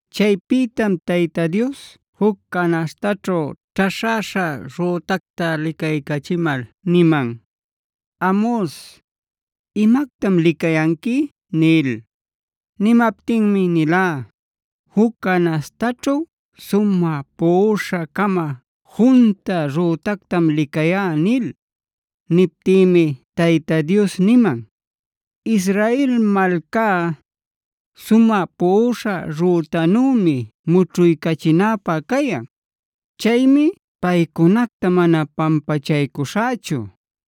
Chaypïtam Tayta Dios juc canaśhtaćhu ćhaśhäśha rütacta licaycachimal niman: “Amos, ¿imactam licayanqui?” nil. Nimaptinmi nilá: “Juc canaśhtaćhu sumä puꞌuśha-cama junta rütactam licayá” nil. Niptïmi Tayta Dios niman: “Israel malcá, sumä puꞌuśha rütanümi mućhuycachinäpä cayan. Chaymi paycunacta mana pampachaycuśhächu.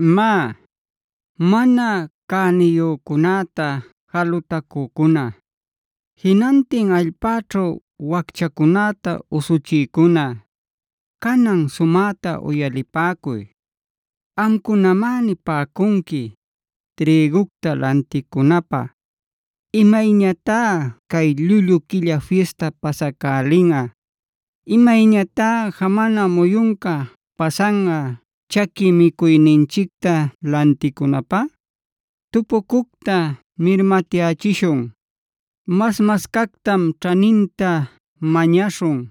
Má, mana cäniyücunäta jalutacücuna, jinantin allpäćhu wacchacunäta usuchïcuna, canan sumäta uyalipäcuy. Amcunamá nipäcunqui: “Trïgucta lanticunapä ¿imayñatá cay ‘Llullu Quilla Fista’ pasacälinꞌa? ¿Imayñatá jamana muyunca pasanꞌa chaqui micuyninchicta lanticunapä? Tupucucta mirmatyächishun; mas-cascactam ćhaninta mañaśhun;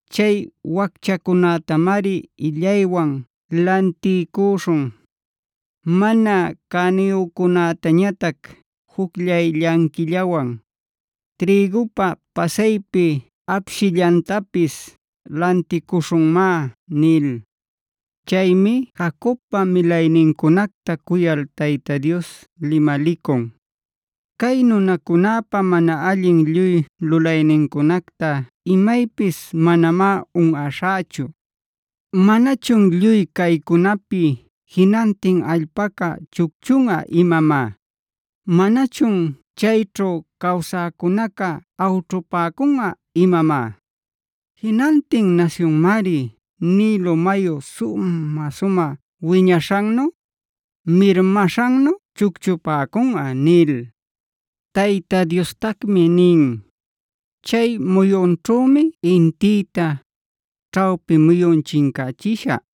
Chay wacchacunätamari illaywan lantiycuśhun, mana cäniyücunätañatac jucllay llanquillawan. Trïgupa pasaypi apshillantapis lanticuśhunmá” nil. Chaymi Jacobpa milaynincunacta cuyal Tayta Dios limalicun: “Cay nunacunäpa mana allin lluy lulaynincunacta imaypis manamá unꞌaśhächu. ¿Manachun lluy caycunapi jinantin allpaca chucchunꞌa imamá? ¿Manachun chayćhu cawsäcunaca awćhupäcunꞌa imamá? Jinantin nasyunmari Nilo mayu sumä-sumä wiñaśhannu, mirmaśhannu chucchupäcunꞌa” nil. Tayta Diostacmi nin: “Chay muyunćhümi intïta, ćhawpi muyun chincachishä;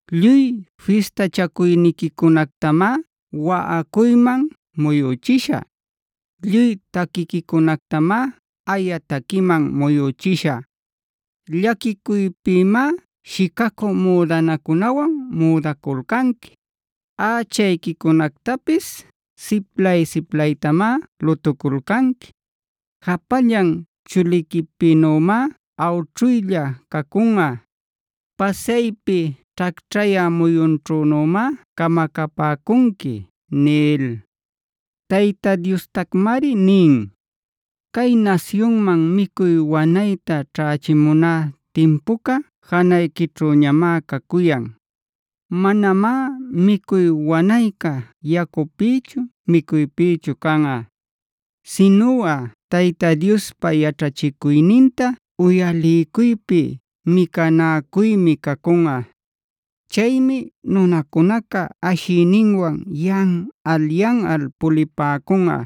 Lluy fistachacuyniquicunactamá waꞌacuyman muyuchishä, lluy taquiquicunactamá aya taquiman muyuchishä. Llaquicuypïmá shicacü müdanacunawan müdaculcanqui; ächayquicunactapis siplay-siplaytamá lutuculcanqui. Japallan chuliquipïnümá awćhuylla cacunꞌa. Pasaypi ćhacćhayä muyunćhünümá camacapäcunqui” nil. Tayta Diostacmari nin: “Cay nasyunman micuy wanayta ćhächimuná timpuca janayquićhüñamá cacuyan; manamá micuy wanayca yacupïchu micuypïchu canꞌa, sinuꞌa Tayta Diospa yaćhachicuyninta uyaliycuypi micanäcuymi cacunꞌa. Chaymi nunacunaca ashiyninwan yanꞌal-yanꞌal pulipäcunꞌa,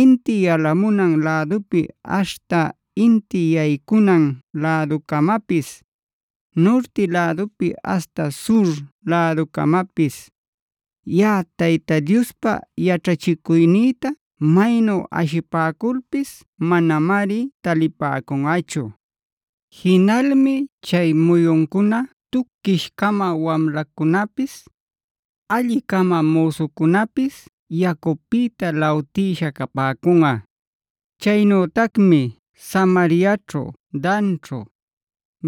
inti yalamunan lädupi aśhta inti yaycunan läducamapis, nurti lädupi aśhta sur läducamapis; Yaꞌa Tayta Diospa yaćhachicuynïta maynu ashipäculpis manamari talipäcunꞌachu. Jinalmi chay muyuncuna tuquish-cama wamlacunäpis, alli-cama müsucunäpis yacupïta lawtïsha capäcunꞌa. Chaynütacmi Samariaćhu, Danćhu,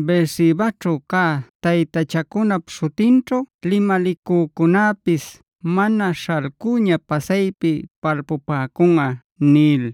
Beersebaćhu cä taytachancunap śhutinćhu limalicücunäpis mana śhalcüña pasaypi palpupäcunꞌa” nil.